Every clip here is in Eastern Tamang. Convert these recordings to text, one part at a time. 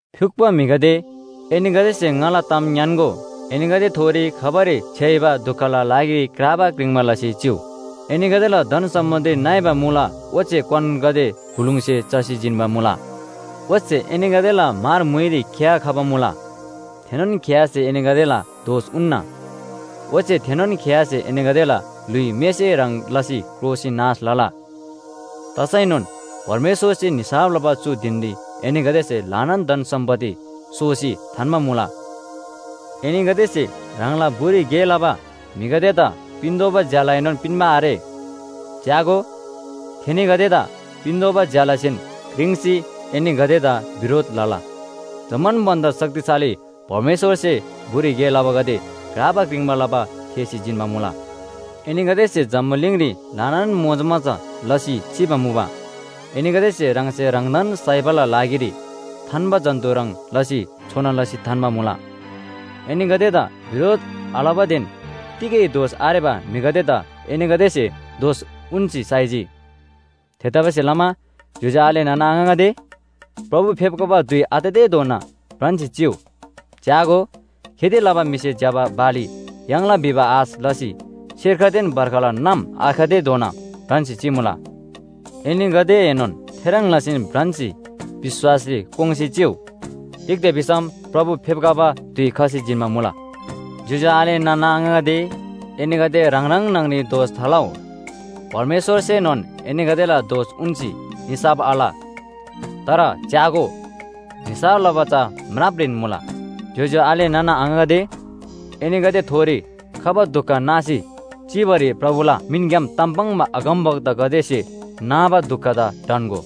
फ्‍युक्‍पो म्‍हिगदे, एनीगदेसे ङाला ताम ङ्‌यान्‍गो, एनीगदेथोरी खबारी छ्‌याइबा दुखला लागिरी क्राबा क्रिङ्बा लसी चिउ। एनीगदेला धन सम्‍पत्ति नइबा मुला ओच्‍छे क्‍वानगदे बुलुङसे चसी जिन्‍बा मुला। ओच्‍छे एनीगदेला म्‍हर म्‍हुइरी खिया खबा मुला। थेनोन खियासे एनीगदेला दोष उन्‍ना। ओच्‍छे थेनोन खियासे एनीगदेला ल्‍हुइ मेसे ह्रङ् लसी क्रोसी नाश लला। तसैनोन परमेश्‍वरसे निसाफ लबा चु धिनरी एनीगदेसे ल्‍हानान धन सम्‍पत्ति सोसी थान्‍बा मुला। एनीगदेसे ह्राङला बुरी गे लबा म्‍हिगदेदा पिन्‍तोःबा ज्‍यालाएनोन पिन्‍बा आरे। च्‍यागो, थेनीगदेदा पिन्‍तोःबा ज्‍यालासेन क्रिङ्सी एनीगदेदा बिरोध लला। जम्‍मान भन्‍दा शक्तिशाली परमेश्‍वरसे बुरी गे लबागदे क्राबा क्रिङ्बा लबा थेःसी जिन्‍बा मुला। एनीगदेसे जम्‍बुलिङरी ल्‍हानान मोजमजा लसी चिबा मुबा, एनीगदेसे ह्राङसे ह्राङदान साइबाला लागिरी थान्‍बा जन्‍तु ह्रङ् लसी छोना लसी थान्‍बा मुला। एनीगदेदा बिरोध आलबादेन तिगै दोष आरेबा म्‍हिगदेदा एनीगदेसे दोष उन्‍सी साइजी। थेतबासेलमा ज्‍योज्‍यो आले नाना आङागदे, प्रभु फेप्‍खबा धुइ आततेधोना भ्रान्‍सी चिउ। च्‍यागो, खेती लबा म्‍हिसे ज्‍यबा बाली याङ्ला भिबा आश लसी सेर्खदेन बर्खला नाम आखतेधोना भ्रान्‍सी चिमुला। एनीगदेएनोन थेह्रङ् लसीन भ्रान्‍सी विश्‍वासरी कोङ्‌सी चिउ। तिग्‍दा भिसम प्रभु फेप्‍खबा धुइ खसी जिन्‍बा मुला। ज्‍योज्‍यो आले नाना आङागदे, एनीगदे ह्राङ ह्राङ न्‍हङरी दोष थालउ। परमेश्‍वरसेनोन एनीगदेला दोष उन्‍सी निसाफ आल। तर च्‍यागो, निसाफ लबा चा म्रापरीन मुला। ज्‍योज्‍यो आले नाना आङागदे, एनीगदेथोरी खबा दुख नासी चिबारी प्रभुला मिनग्‍याम ताम पाङ्बा अगमवक्तागदेसे नाबा दुखदा ढन्‍गो।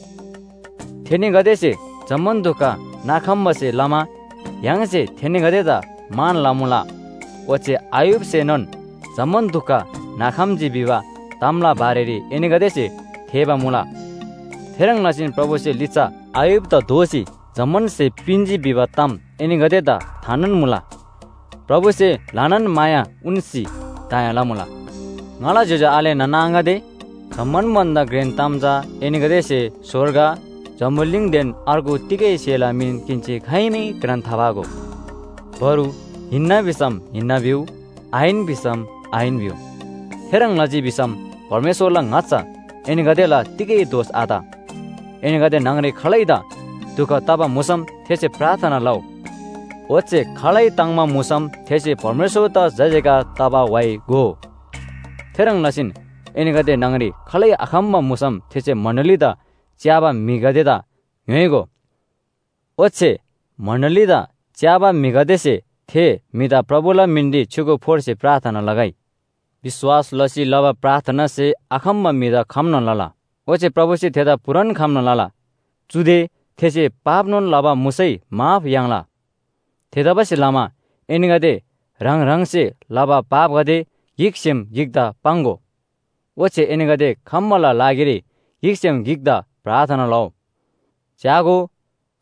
थेनीगदेसे जम्‍मान दुख नाखम्‍बासे लमा य्‍हाङसे थेनीगदेदा मान लमुला। ओच्‍छे अय्‍यूबसेनोन जम्‍मान दुख नाखम्‍जी भिबा तामला बारेरी एनीगदेसे थेःबा मुला। थेह्रङ् लसीन प्रभुसे लिच्‍छा अय्‍यूबदा दोःसी जम्‍मान स्‍हे पिन्‍जी भिबा ताम एनीगदेदा थानोन मुला। प्रभुसे ल्‍हानान माया उन्‍सी दया लमुला। ङाला ज्‍योज्‍यो आले नाना आङागदे, जम्‍मान भन्‍दा घ्रेन ताम चा एनीगदेसे स्‍वर्ग, जम्‍बुलिङदेन अर्गु तिगै स्‍हेला मिन किन्‍सी खाइमै घ्रान थाफागो। बरु “हिन्‍ना” भिसम “हिन्‍ना” भिउ “आहिन” भिसम “आहिन” भिउ। थेह्रङ् लजी भिसम परमेश्‍वरला ङाच्‍छा एनीगदेला तिगै दोष आत। एनीगदे न्‍हङरी खालैदा दुख तबा मुसम थेसे प्रार्थना लउ। ओच्‍छे खालै ताङ्‍बा मुसम थेसे परमेश्‍वरदा जयजयकार तबा व्‍हाइ गोउ। थेह्रङ् लसीन एनीगदे न्‍हङरी खालै आखम्‍बा मुसम थेसे मण्‍डलीदा च्‍याबा म्‍हिगदेदा ङ्‌योइगो। ओच्‍छे मण्‍डलीदा च्‍याबा म्‍हिगदेसे थे म्‍हिदा प्रभुला मिनरी छ्‌युगु फोर्सी प्रार्थना लगै। विश्‍वास लसी लबा प्रार्थनासे आखम्‍बा म्‍हिदा खम्‍ना लला। ओच्‍छे प्रभुसे थेदा पूरान खम्‍ना लला। चुदे थेसे पापनोन लबा मुसै माफ याङ्ला। थेतबासेलमा एनीगदे ह्राङ ह्राङसे लबा पापगदे गिकसेम गिकदा पाङ्‍गो। ओच्‍छे एनीगदे खम्‍बाला लागिरी गिकसेम गिकदा प्रार्थना लउ। च्‍यागो,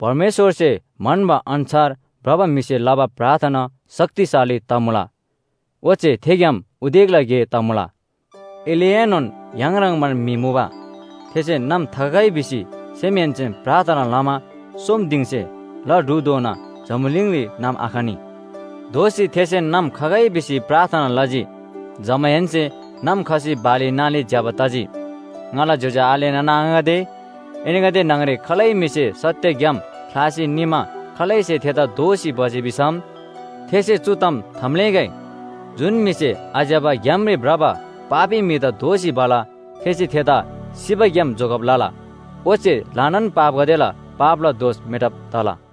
परमेश्‍वरसे म्‍हन्‍बा अन्‍छार भ्रबा म्‍हिसे लबा प्रार्थना शक्तिशाली तमुला, ओच्‍छे थेग्‍याम उदेकला गे तमुला। एलियाएनोन य्‍हाङ ह्रङ्‌बान म्‍हि मुबा। थेसे नाम थाखगै भिसी सेमहेन्‍सेन प्रार्थना लमा सोम दिङसे ला ढुधोना जम्‍बुलिङरी नाम आखनी। दोःसी थेसे नाम खगै भिसी प्रार्थना लजी। जमाहेन्‍से नाम खसी बाली नाली ज्‍यबा तजी। ङाला ज्‍योज्‍यो आले नाना आङागदे, एनीगदे न्‍हङरी खालै म्‍हिसे सत्‍य ग्‍याम ख्‍लासी निमा खालैसे थेदा दोःसी भजी भिसम, थेसे चु ताम थाम्‍लेःगै, जुन म्‍हिसे आज्‍यबा ग्‍यामरी भ्रबा पापी म्‍हिदा दोःसी भला थेसे थेदा सिबाग्‍याम जोगब लला, ओच्‍छे ल्‍हानान पापगदेला पापला दोष मेटब तला।